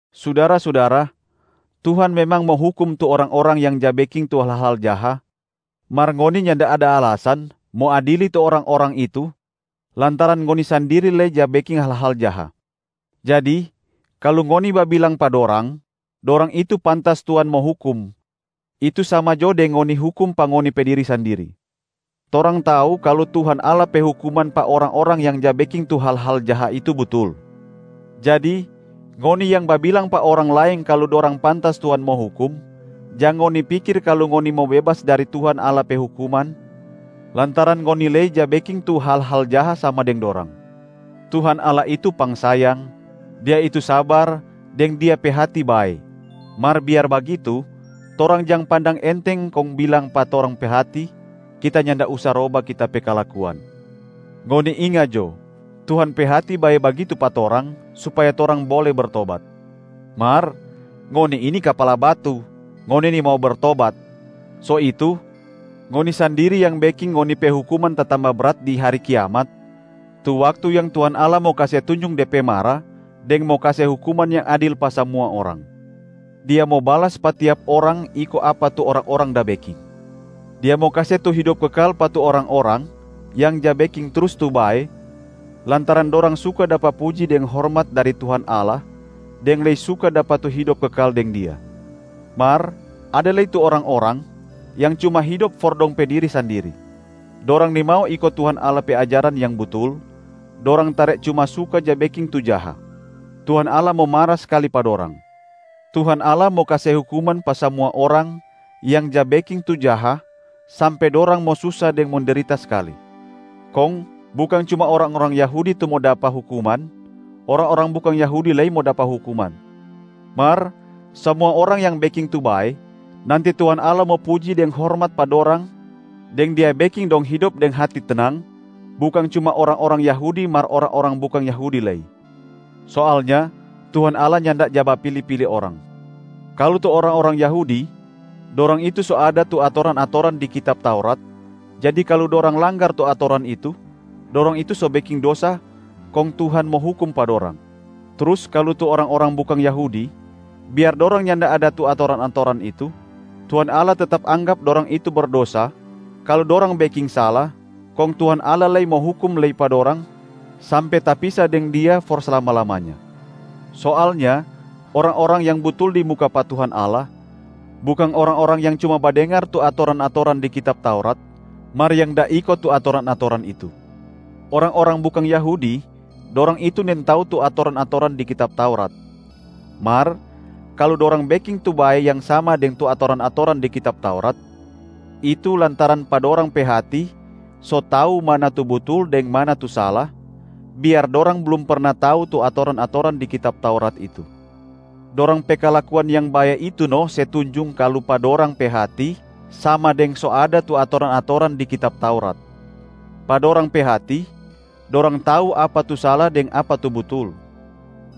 Sudara-sudara, Tuhan memang mo hukum tu orang-orang yang ja beking tu hal-hal jaha, mar ngoni nyanda ada alasan mo adili tu orang-orang itu lantaran ngoni sandiri lei ja beking hal-hal jaha. Jadi kalu ngoni babilang pa dorang, dorang itu pantas Tuhan mo hukum, itu sama jo deng ngoni hukum pa ngoni pe diri sandiri. Torang tau kalu Tuhan Allah pe hukuman pa orang-orang yang ja beking tu hal-hal jaha itu butul. Jadi ngoni yang babilang pa orang laeng kalu dorang pantas Tuhan mo hukum, jang ngoni pikir kalu ngoni mo bebas dari Tuhan Allah pe hukuman, lantaran ngoni lei ja beking tu hal-hal jaha sama deng dorang. Tuhan Allah itu pangsayang, Dia itu sabar deng Dia pe hati bae, mar biar bagitu torang jang pandang enteng kong bilang pa torang pe hati, “Kita nyanda usa roba kita pe kalakuan.” Ngoni inga jo, Tuhan pe hati bae bagitu pa torang supaya torang bole bertobat. Mar ngoni ini kapala batu, ngoni nimau bertobat. So itu ngoni sandiri yang beking ngoni pe hukuman tatamba brat di hari kiamat, tu waktu yang Tuhan Allah mo kase tunjung De pe mara deng mo kase hukuman yang adil pa samua orang. Dia mo balas pa tiap orang iko apa tu orang-orang da beking. Dia mo kase tu hidop kekal pa tu orang-orang yang ja beking trus tu bae lantaran dorang suka dapa puji deng hormat dari Tuhan Allah, deng lei suka dapa tu hidop kekal deng Dia. Mar ada lei tu orang-orang yang cuma hidop for dong pe diri sandiri. Dorang nimau iko Tuhan Allah pe ajaran yang butul, dorang tare cuma suka ja beking tu jaha. Tuhan Allah mo mara skali pa dorang. Tuhan Allah mo kase hukuman pa samua orang yang ja beking tu jaha sampe dorang mo susa deng mendrita skali. Kong bukang cuma orang-orang Yahudi tu mo dapa hukuman, orang-orang bukang Yahudi lei mo dapa hukuman. Mar samua orang yang beking tu bae, nanti Tuhan Allah mo puji deng hormat pa dorang deng Dia beking dong hidop deng hati tenang, bukang cuma orang-orang Yahudi mar orang-orang bukang Yahudi lei. Soalnya Tuhan Allah nyanda ja bapili-pili orang. Kalu tu orang-orang Yahudi, dorang itu so ada tu atoran-atoran di kitab Taurat, jadi kalu dorang langgar tu atoran itu, dorang itu so beking dosa kong Tuhan mo hukum pa dorang. Trus kalu tu orang-orang bukang Yahudi, biar dorang nyanda ada tu atoran-atoran itu, Tuhan Allah tetap anggap dorang itu berdosa kalu dorang beking sala, kong Tuhan Allah lei mo hukum lei pa dorang sampe tapisa deng Dia for slama-lamanya. Soalnya orang-orang yang butul di muka pa Tuhan Allah, bukang orang-orang yang cuma badengar tu atoran-atoran di kitab Taurat, mar yang da iko tu atoran-atoran itu. Orang-orang bukang Yahudi, dorang itu nintau tu atoran-atoran di kitab Taurat. Mar kalu dorang beking tu bae yang sama deng atoran-atoran di kitab Taurat, itu lantaran pa dorang pe hati so tau mana tu butul deng mana tu sala, biar dorang blum perna tau tu atoran-atoran di kitab Taurat itu. Dorang pe kalakuan yang bae itu no se tunjung kalu pa dorang pe hati sama deng so ada tu atoran-atoran di kitab Taurat. Pa dorang pe hati, dorang tau apa tu sala deng apa tu butul.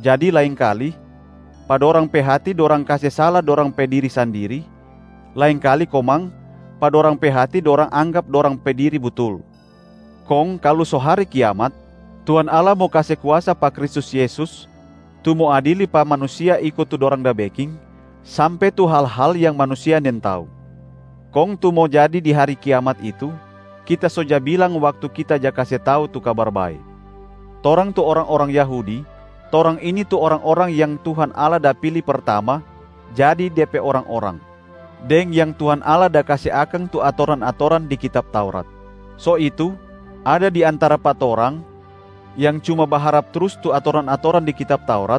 Jadi laengkali, pa dorang pe hati dorang kase sala dorang pe diri sandiri, laengkali komang pa dorang pe hati dorang anggap dorang pe diri butul. Kong kalu so hari Kiamat, Tuhan Allah mo kase kuasa pa Kristus Yesus tu mo adili pa manusia iko tu dorang da beking, sampe tu hal-hal yang manusia nintau. Kong tu mo jadi di hari kiamat itu, kita so ja bilang waktu kita ja kase tau tu Kabar Bae. Torang tu orang-orang Yahudi, torang ini tu orang-orang yang Tuhan Allah da pili pertama jadi De pe orang-orang, deng yang Tuhan Allah da kase akang tu atoran-atoran di kitab Taurat. So itu ada di antara pa torang yang cuma baharap trus tu atoran-atoran di kitab Taurat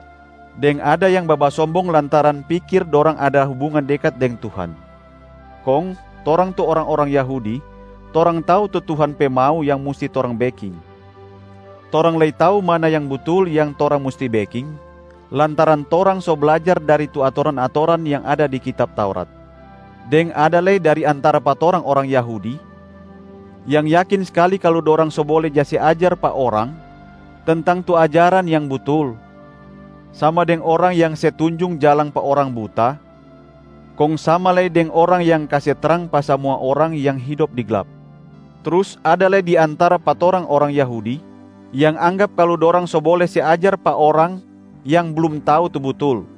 deng ada yang babasombong lantaran pikir dorang ada hubungan dekat deng Tuhan. Kong torang tu orang-orang Yahudi, torang tau tu Tuhan pe mau yang musti torang beking. Torang lei tau mana yang butul yang torang musti beking lantaran torang so blajar dari tu atoran-atoran yang ada di kitab Taurat. Deng ada lei dari antara pa torang orang Yahudi yang yakin skali kalu dorang so bole ja se ajar pa orang tentang tu ajaran yang butul, sama deng orang yang se tunjung jalang pa orang buta, kong sama lei deng orang yang kase trang pa samua orang yang hidop di glap. Trus ada lei di antara pa torang orang Yahudi yang anggap kalu dorang so bole se ajar pa orang yang blum tau tu butul.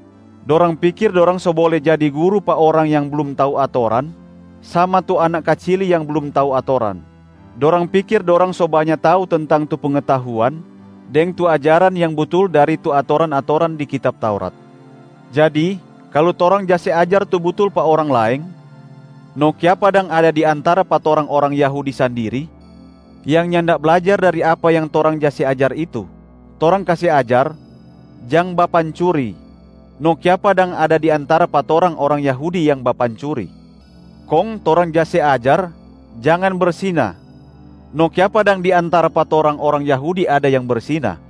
Dorang pikir dorang so bole jadi guru pa orang yang blum tau atoran sama tu anak kacili yang blum tau atoran. Dorang pikir dorang so banya tau tentang tu pengetahuan deng tu ajaran yang butul dari tu atoran-atoran di kitab Taurat. Jadi kalu torang ja se ajar tu butul pa orang laeng, no kiapa dang ada di antara pa torang orang Yahudi sandiri yang nyanda blajar dari apa yang torang ja se ajar itu? Torang kase ajar, ‘jang bapancuri’, no kiapa dang ada di antara pa torang orang Yahudi yang bapancuri? Kong torang ja se ajar ‘jang bersina’, no kiapa dang di antara pa torang orang Yahudi ada yang bersina?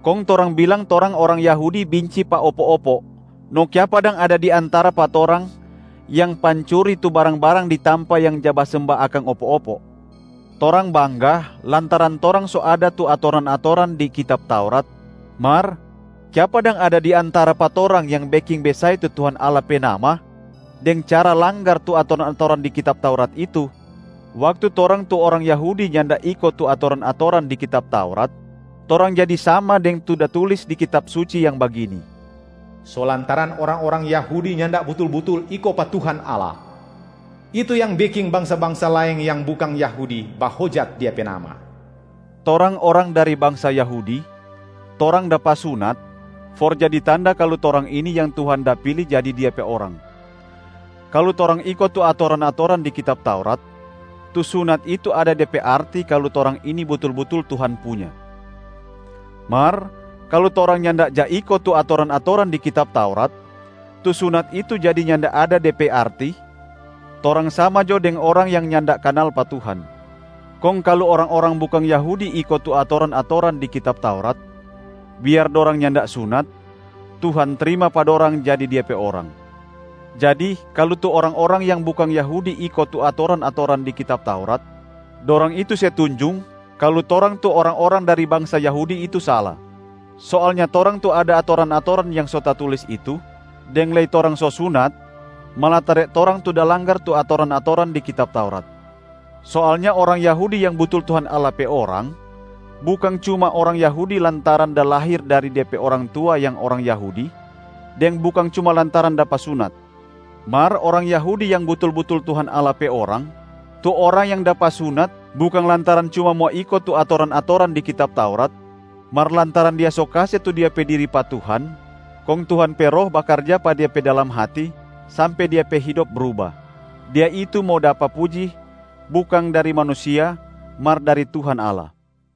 Kong torang bilang torang orang Yahudi binci pa opo-opo, no kiapa dang ada di antara pa torang yang pancuri tu barang-barang di tampa yang ja basemba akang opo-opo? Torang bangga lantaran torang so ada tu atoran-atoran di kitab Taurat, mar kiapa dang ada di antara pa torang yang beking besae tu Tuhan Allah pe nama deng cara langgar tu atoran-atoran di kitab Taurat itu? Waktu torang tu orang Yahudi nyanda iko tu atoran-atoran di kitab Taurat, torang jadi sama deng tu da tulis di Kitab Suci yang bagini, “So lantaran orang-orang Yahudi nyanda butul-butul iko pa Tuhan Allah, itu yang beking bangsa-bangsa laeng yang bukang Yahudi bahojat Dia pe nama.” Torang orang dari bangsa Yahudi, torang dapa sunat for jadi tanda kalu torang ini yang Tuhan da pili jadi Dia pe orang. Kalu torang iko tu atoran-atoran di kitab Taurat, tu sunat itu ada de pe arti kalu torang ini butul-butul Tuhan punya. Mar kalu torang nyanda ja iko tu atoran-atoran di kitab Taurat, tu sunat itu jadi nyanda ada de pe arti, torang sama jo deng orang yang nyanda kanal pa Tuhan. Kong kalu orang-orang bukang Yahudi iko tu atoran-atoran di kitab Taurat, biar dorang nyanda sunat, Tuhan trima pa dorang jadi Dia pe orang. Jadi kalu tu orang-orang yang bukang Yahudi iko tu atoran-atoran di kitab Taurat, dorang itu se tunjung kalu torang tu orang-orang dari bangsa Yahudi itu sala. Soalnya torang tu ada atoran-atoran yang so tatulis itu deng lei torang so sunat, malatare torang tu da langgar tu atoran-atoran di kitab Taurat. Soalnya orang Yahudi yang butul Tuhan Allah pe orang, bukang cuma orang Yahudi lantaran da lahir dari de pe orang tua yang orang Yahudi, deng bukang cuma lantaran dapa sunat. Mar orang Yahudi yang butul-butul Tuhan Allah pe orang, tu orang yang dapa sunat bukang lantaran cuma mo iko tu atoran-atoran di kitab Taurat, mar lantaran dia so kase tu dia pe diri pa Tuhan kong Tuhan pe Roh bakarja pa dia pe dalam hati sampe dia pe hidop bruba. Dia itu mo dapa puji bukang dari manusia mar dari Tuhan Allah.